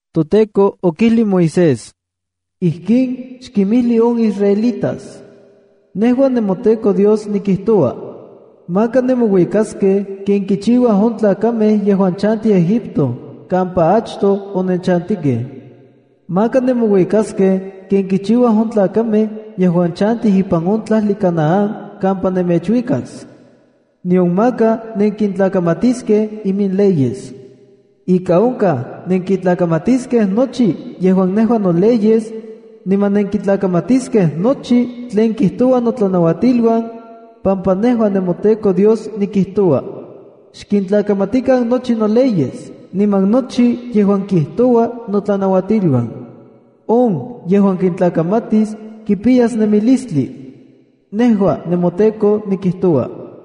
ToTEKO okijli Moisés: “Ijkin xkimijli on israelitas: Nejua nemoTEKO Dios nikijtoua. Maka nemouikaskej ken kichiuaj on tlakamej yejuan chantij Egipto kampa achtoj onenchantikej. Maka nemouikaskej ken kichiuaj on tlakamej yejuan chantij ipan on tlajli Canaán kampa nemechuikas. Nion maka nenkintlakamatiskej iminleyes. Ika onkaj nenkitlakamatiskej nochi yejuan nejua noleyes, niman nenkitlakamatiskej nochi tlen kijtoua notlanauatiluan, pampa nejua nemoTEKO Dios nikijtoua. Xkintlakamatikan nochi noleyes niman nochi yejuan kijtouaj notlanauatiluan. On yejuan kintlakamatis kipiyas nemilistli. Nejua nemoTEKO nikijtoua.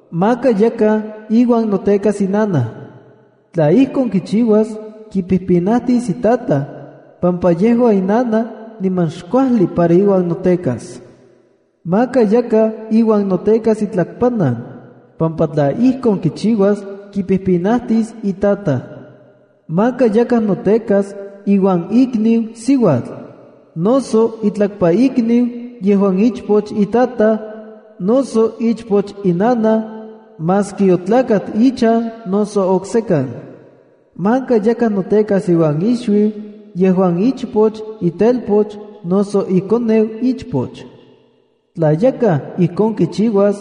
Maka yakaj iuan notekas inanaj. Tla ijkon kichiuas, kipijpinajtis itataj, pampa yejua inanaj niman xkuajli para iuan notekas. Maka yakaj iuan notekas itlakpanan, pampa tla ijkon kichiuas, kipijpinatis itataj. ’Maka yakaj notekas iuan ikniu siuatl, noso itlakpaikniu, yejuan ichpoch itataj, noso ichpoch inanaj, maski otlakat ichan noso oksekan. ’Maka yakaj notekas iuan ixuiu, yejuan ichpoch itelpoch, noso ikoneu ichpoch. Tla yakaj ijkon kichiuas,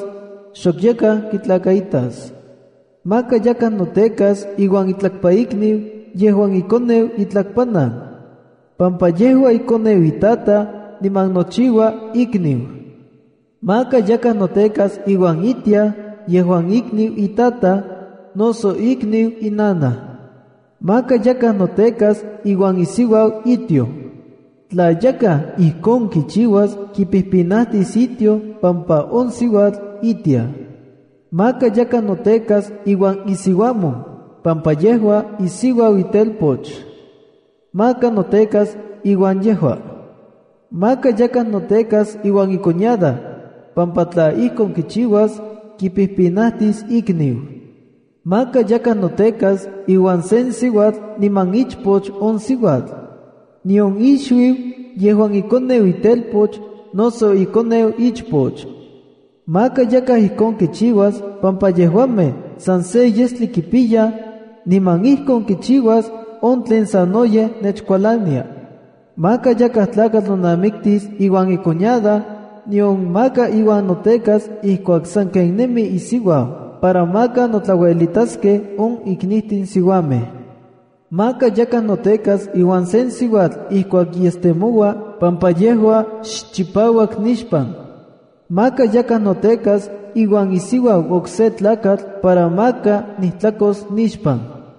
xok yakaj kitlakaitas. Maka yakaj notekas iuan itlakpaikniu yejuan ikoneu itlakpanan, pampa yejua ikoneu itataj, niman nochiua ikniu. Maka yakaj notekas iuan itiaj yejuan ikniu itataj, noso ikniu inanaj. Maka yakaj notekas iuan isiuau itioj. Tla yakaj ijkon kichiuas kipijpinajtis itioj pampa on siuatl itiaj. Maka yakaj notekas iuan isiuamon, pampa yejua isiuau itelpoch. Maka notekas iuan yejua. Maka yakaj notekas iuan icuñada, pampa tla ijkon kichiuas, kipijpinajtis ikniu. ’Maka yakaj notekas iuan sen siuatl niman ichpoch on siuatl, nion ixuiu yejuan ikoneu itelpoch noso ikoneu ichpoch. Maka yakaj ijkon kichiuas pampa yejuamej san se yestli kipiyaj, niman ijkon kichiuas on tlen sanoyej nechkualania. ’Maka yakaj tlakatl nonamiktis iuan icuñada, nion maka iuan notekas ijkuak sanken nemi isiuau para maka notlauelitaskej on iknijtin siuamej. ’Maka yakaj notekas iuan sen siuatl ijkuak yestemoua pampa yejua xchipauak nixpan. ’Maka yakaj notekas iuan isiuau okse tlakatl para maka nijtlakos nixpan.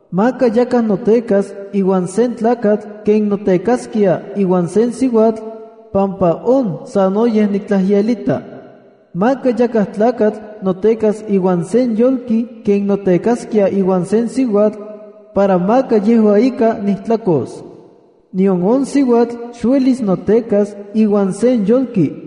’Maka yakaj notekas iuan sen tlakatl ken notekaskia iuan sen siuatl, pampa on sanoyej niktlajyelita. ’Maka yakaj tlakatl notekas iuan sen yolki ken notekaskia iuan sen siuatl, para maka yejua ika nijtlakos. Nion on siuatl xuelis notekas iuan sen yolki,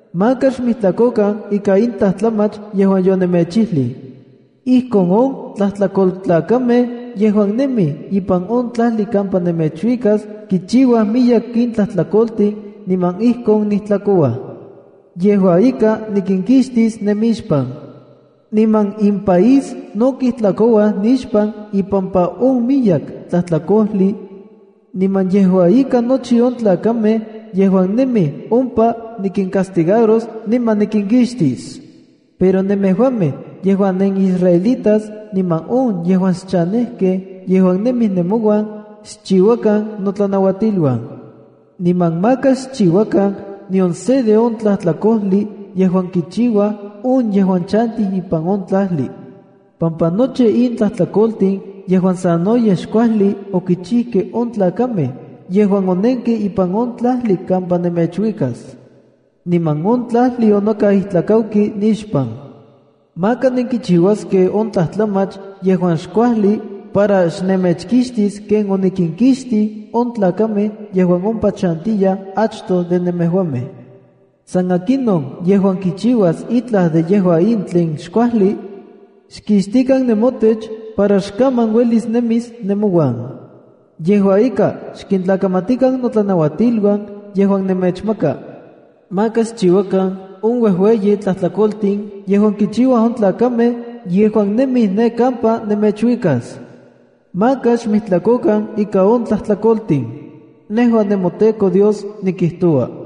’Maka xmijtlakokan ika in tlajtlamach yejuan yonemechijli. Ijkon on tlajtlakoltlakamej yejuan nemij ipan on tlajli kampa nemechuikas kichiuaj miyek in tlajtlakoltin niman ijkon nijtlakouaj. Yejua ika, nikinkixtis nemixpan. Niman impaís no kijtlakouaj nixpan ipampa on miyek tlajtlakojli, niman yejua ika nochi on tlakamej yejuan nemij ompa nikincastigaros niman nikinkixtis. Pero nemejuamej yejuan nenisraelitas niman on yejuan xchanejkej yejuan nemij nemouan xchiuakan notlanauatiluan. Niman maka xchiuakan nion se de on tlajtlakojli yejuan kichiuaj on yejuan chantij ipan on tlajli, pampa nochi in tlajtlakoltin yejuan sanoyej xkuajli okichijkej on tlakamej yejuan onenkej ipan on tlajli kampa nemechuikas. Niman on tlajli onokau ijtlakauki nixpan. Maka nenkichiuaskej on tlajtlamach yejuan xkuajli para xnemechkixtis ken onikinkixtij on tlakamej yejuan ompa chantiyaj achtoj de nemejuamej. San akinon yejuan kichiuas itlaj de yejua in tlen xkuajli, xkixtikan nemotech para xokaman uelis nemis nemouan. Yejua ika, xkintlakamatikan notlanauatiluan yejuan nemechmaka. Maka xchiuakan on uejueyi tlajtlakoltin yejuan kichiuaj on tlakamej yejuan nemij ne kampa nemechuikas. Maka xmijtlakokan ika on tlajtlakoltin. Nejua nemoTEKO Dios nikijtoua.”